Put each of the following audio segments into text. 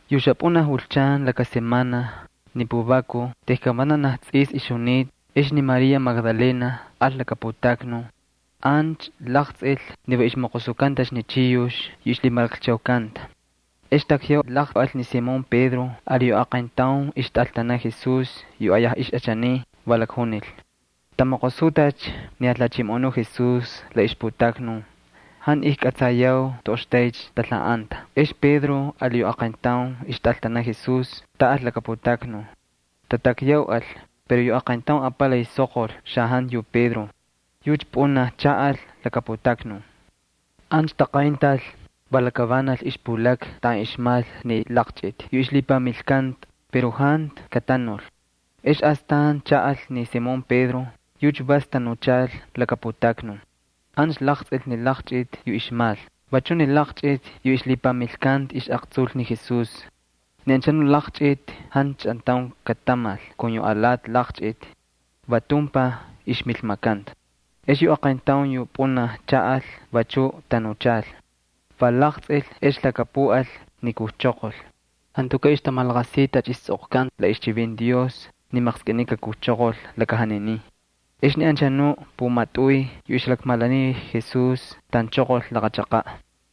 Yu xapꞌunaj julchan laka semana ni puvakuj tejkan vanaj tsꞌis ixjunita ex ni María Magdalena al laka putaknun. Ancha laqtsꞌil ni va ixmoqosukantacha ni chiyux yu ixlhimalakchaukanta. Ex takyaulaqꞌal ni Simón Pedro ali yu aqayntaun ixtꞌaltanaꞌ Jesús yu ayaj ixꞌachaniy. Va lakjunil: —¡Tamoqosutacha ni Jalhachimoꞌonu Jesús la ixputaknun! ¡Jantu ijkꞌatsayau toꞌoxtaycha talhaꞌanta! Ex Pedro ali yu aqayntaun ixtꞌaltanaꞌ Jesús taꞌal laka putaknun. Tatakyauꞌal pero yu aqayntaun apalay soqol xajantu yu Pedro, yucha pꞌunaj chaꞌal laka putaknun. Ancha taqayntal, va lakavanal ixpulakna taꞌan ixmal ni laqchꞌiti yu ixlhipamilkanta pero jantu katanul. Ex astan chaꞌal ni Simón Pedro, yucha vas tanuchal laka putaknun. Ancha laqtsꞌil ni laqchꞌiti yu ixmal, vachuꞌ ni laqchꞌiti yu ixlhipamilnikanta ixꞌaqtsul ni Jesús. Ni anchanuꞌ laqchꞌiti jantu chꞌantaun katamal kun yu alati laqchꞌiti, va tumpaj ixmilmakanta. Ex yu aqayntaun yu pꞌunaj chaꞌal vachuꞌ tanuchal. Va laqtsꞌil ex lhakapuꞌal ni kujchoqol. Jantukaꞌ ixtamalaqasiy tacha istsꞌoqkantacha la ixchivinti Dios ni maqskꞌiniy kakujchoqol laka janinin. Ex ni anchanuꞌ pumatꞌuy yu ixjalakmalaniy Jesús taꞌanchoqol laqa chaqaꞌ.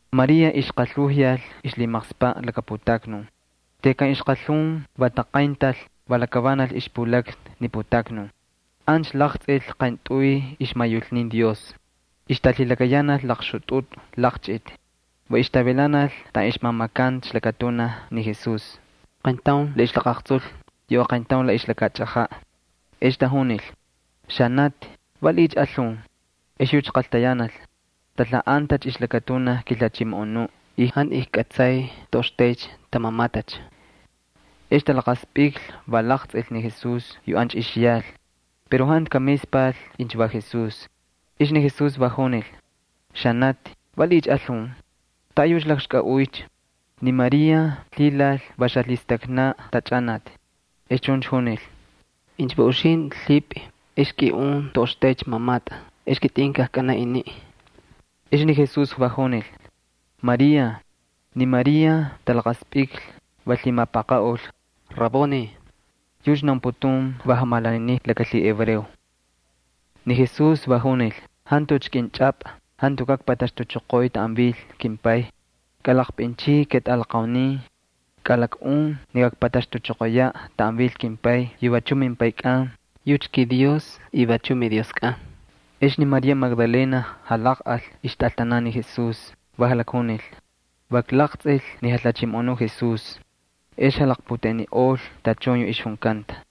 María ixqalhunyal ixlhimaqspaꞌ laka putaknun. Tejkan ixqalhun va taqayntal, va lakavanal ixpulakna ni putaknun. Ancha laqtsꞌil qayntꞌuy ixmayulnin Dios, ixtalhilakayanal laqxutꞌutꞌu laqchꞌiti, va ixtavilanal taꞌan ixmamakanta ixlakatunaj ni Jesús, qayntaun la ixlaqaꞌaqtsul, yu aqayntaun la ixlakachꞌajaꞌ. Ex tajunil: —Xanati, ¿valiꞌiycha alhun? Ex yucha qaltayanal: —Talhaꞌantacha ixlakatunaj kiJalhachimoꞌonuꞌ y jantu ijkꞌatsay toꞌoxtaycha tamamatacha. Ex talaqaspꞌiklhi, va laqtsꞌil ni Jesús yu ancha ixyal pero jantu kamispal incha va Jesús. Ex ni Jesús va junil: —Xanati, ¿valiꞌiycha alhun? ¿Taꞌayucha lakxkꞌaꞌuycha? Ni María lhilal va xalhistaknaꞌ ni jatachꞌanati, ex chuncha junil: —Incha va uxintꞌi lhipꞌi ex kiꞌun toꞌoxtaycha mamatꞌa ex kitꞌin kajkꞌanaꞌ iniꞌ. Ex ni Jesús junil: —María. Ni María talaqaspꞌiklhi, va lhimapaqaꞌul: —¡Raboni! (Yucha naunputun maestro laka lhihebreo.) Ni Jesús va junil: —Jantucha kꞌinchꞌapꞌa, jantukaꞌ kpataxtuchoqoy taꞌan vil kimPay. Kꞌalaqpꞌinchꞌiy ketꞌalaqaunin. Kꞌalakꞌun ni kakpataxtuchoqoyaꞌ taꞌan vil kimPay yu vachuꞌ mimPaykꞌan, yucha kiDios y vachuꞌ miDioskꞌan. Ex ni María Magdalena jalaqꞌal ixtꞌaltanan ni Jesús, va jalakjunil: —¡Va klaqtsꞌil ni Jalhachimoꞌonu Jesús! Ex jalaqputeꞌeniꞌol tachun yu ixjunkanta.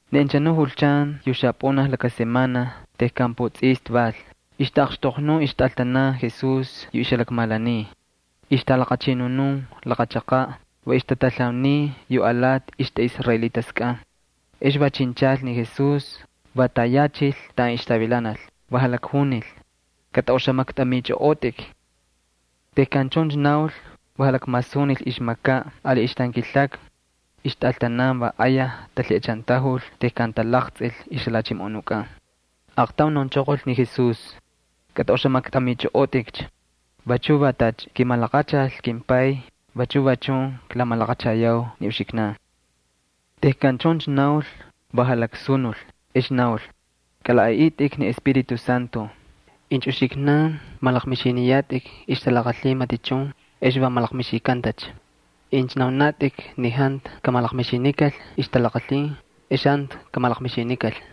Ni anchanu julchan yu xapꞌunaj laka semana tejkan putsꞌista val, ixtaꞌaqxtoqnun ixtꞌaltanan Jesús yu ixjalakmalaniy. Ixtalaqachꞌinunun laqa chaqaꞌ, va ixtatalhauniy yu alati ixtꞌaꞌisraelitaskꞌan. Ex va chinchal ni Jesús, va tayachil taꞌan ixtavilanal. Va lakjunil: —Kꞌatꞌaꞌoxamaktꞌamichꞌoꞌotꞌik. Tejkan chuncha naul, va jalakmasunil ixmakaꞌ ali ixtankilakna. Ixtꞌaltanan va ayaj talhiꞌachantajul tejkan talaqtsꞌil ixJalhachimoꞌonukꞌan. Aaqtaun naunchoqol ni Jesús: —Kꞌatꞌaꞌoxamaktꞌamichꞌoꞌotꞌik. Vachu va tacha kimalaqachal ni kimPay vachu va chun klamalaqachayau ni uxiknan. Tejkan chuncha naul, va jalaksunul ex naul: —Kꞌalaꞌaꞌitꞌik ni Espíritu Santo. Incha uxiknan malaqmixiniyatꞌik ixtalaqalhin matichun ex va malaqmixikantacha. Incha naunatꞌik ni jantu kamalaqmixikal ixtalaqalhin ex jantu kamalaqmixikal.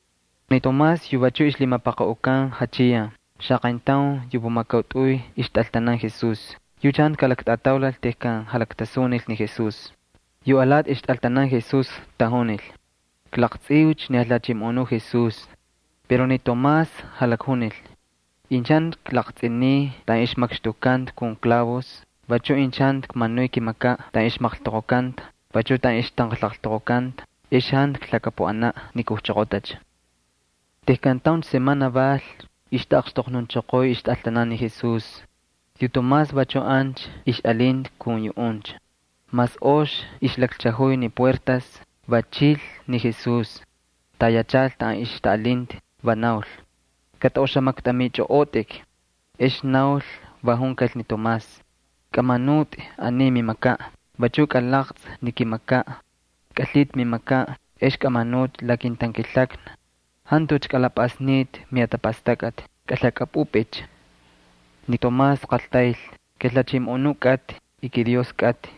Ni Tomás yu vachuꞌ ixlhimapaqaꞌukan Jachiyan, xaqayntaun yu pumakautꞌuy ixtꞌaltanan Jesús, yucha jantu kalaktꞌataulal tejkan jalaktasunil ni Jesús. Yu alati ixtꞌaltanan Jesús tajunil: —¡Klaqtsꞌiucha ni Jalhachimoꞌonu Jesús! Pero ni Tomás jalakjunil: —Incha jantu klaqtsꞌiniy taꞌan ixmakxtukkanta kun klavos, vachuꞌ incha jantu kmanuy kimakaꞌ taꞌan ixmaqltoqokanta, vachuꞌ taꞌan ixtanqalaqltoqokanta, ex jantu klhakapuꞌanaꞌ ni kujchoqotacha. Tejkan tauncha semana val ixtaꞌaqxtoqnunchoqoy ixtꞌaltanan ni Jesús. Yu Tomás vachuꞌ ancha ixꞌalinta kun yuꞌuncha. Mas ox ixlakchajuy ni puertas, va chil ni Jesús, tayachal taꞌan ixtaꞌalinta. Va naul: —Kꞌatꞌaꞌoxamaktꞌamichꞌoꞌotꞌik. Ex naul, va junkal ni Tomás: —Kꞌamanutꞌi aniy mimakaꞌ, vachuꞌ kalaqtsꞌi ni kimakaꞌ. Kꞌalhitꞌi mimakaꞌ ex kꞌamanutꞌi la kintankilakna. Jantucha kꞌalapꞌasnitꞌi mijatapastakꞌatꞌi, kꞌalhakꞌapꞌupꞌicha. Ni Tomás qaltayl: —¡KiJalhachimoꞌonu kꞌatꞌi y kiDios kꞌatꞌi!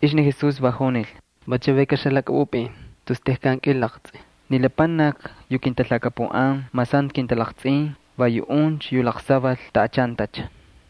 Ex ni Jesús va junil: —¿Va chavaykaꞌ xalhakꞌapꞌupꞌin tejkan kꞌilaqtsꞌi? Ni lapanakni yu kintalhakapuꞌan mas jantu kintalaqtsꞌin va yuꞌuncha yu laqsaval taꞌachantacha.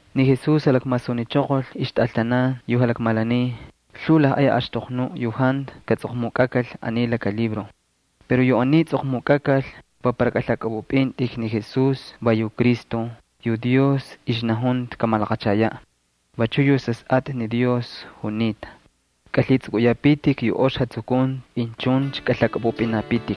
Ni Jesús jalakmasunichoqol ixtꞌaltanan yu jalakmalaniy lhuu lajꞌay axtoqnuꞌ yu jantu katsꞌoqmukꞌakal aniy laka libro. Pero yu aniy tsꞌoqmukꞌakal va para kꞌalhakꞌapꞌupꞌintꞌik ni Jesús va yu Cristo, yu Dios ixnajunta kamalaqachayaꞌ, vachuꞌ yu Sasꞌatꞌa Dios junita. Kꞌalhitsꞌukꞌuyapitik yu ox jatsukunti incha chuncha kꞌalhakꞌapꞌupꞌinapitik.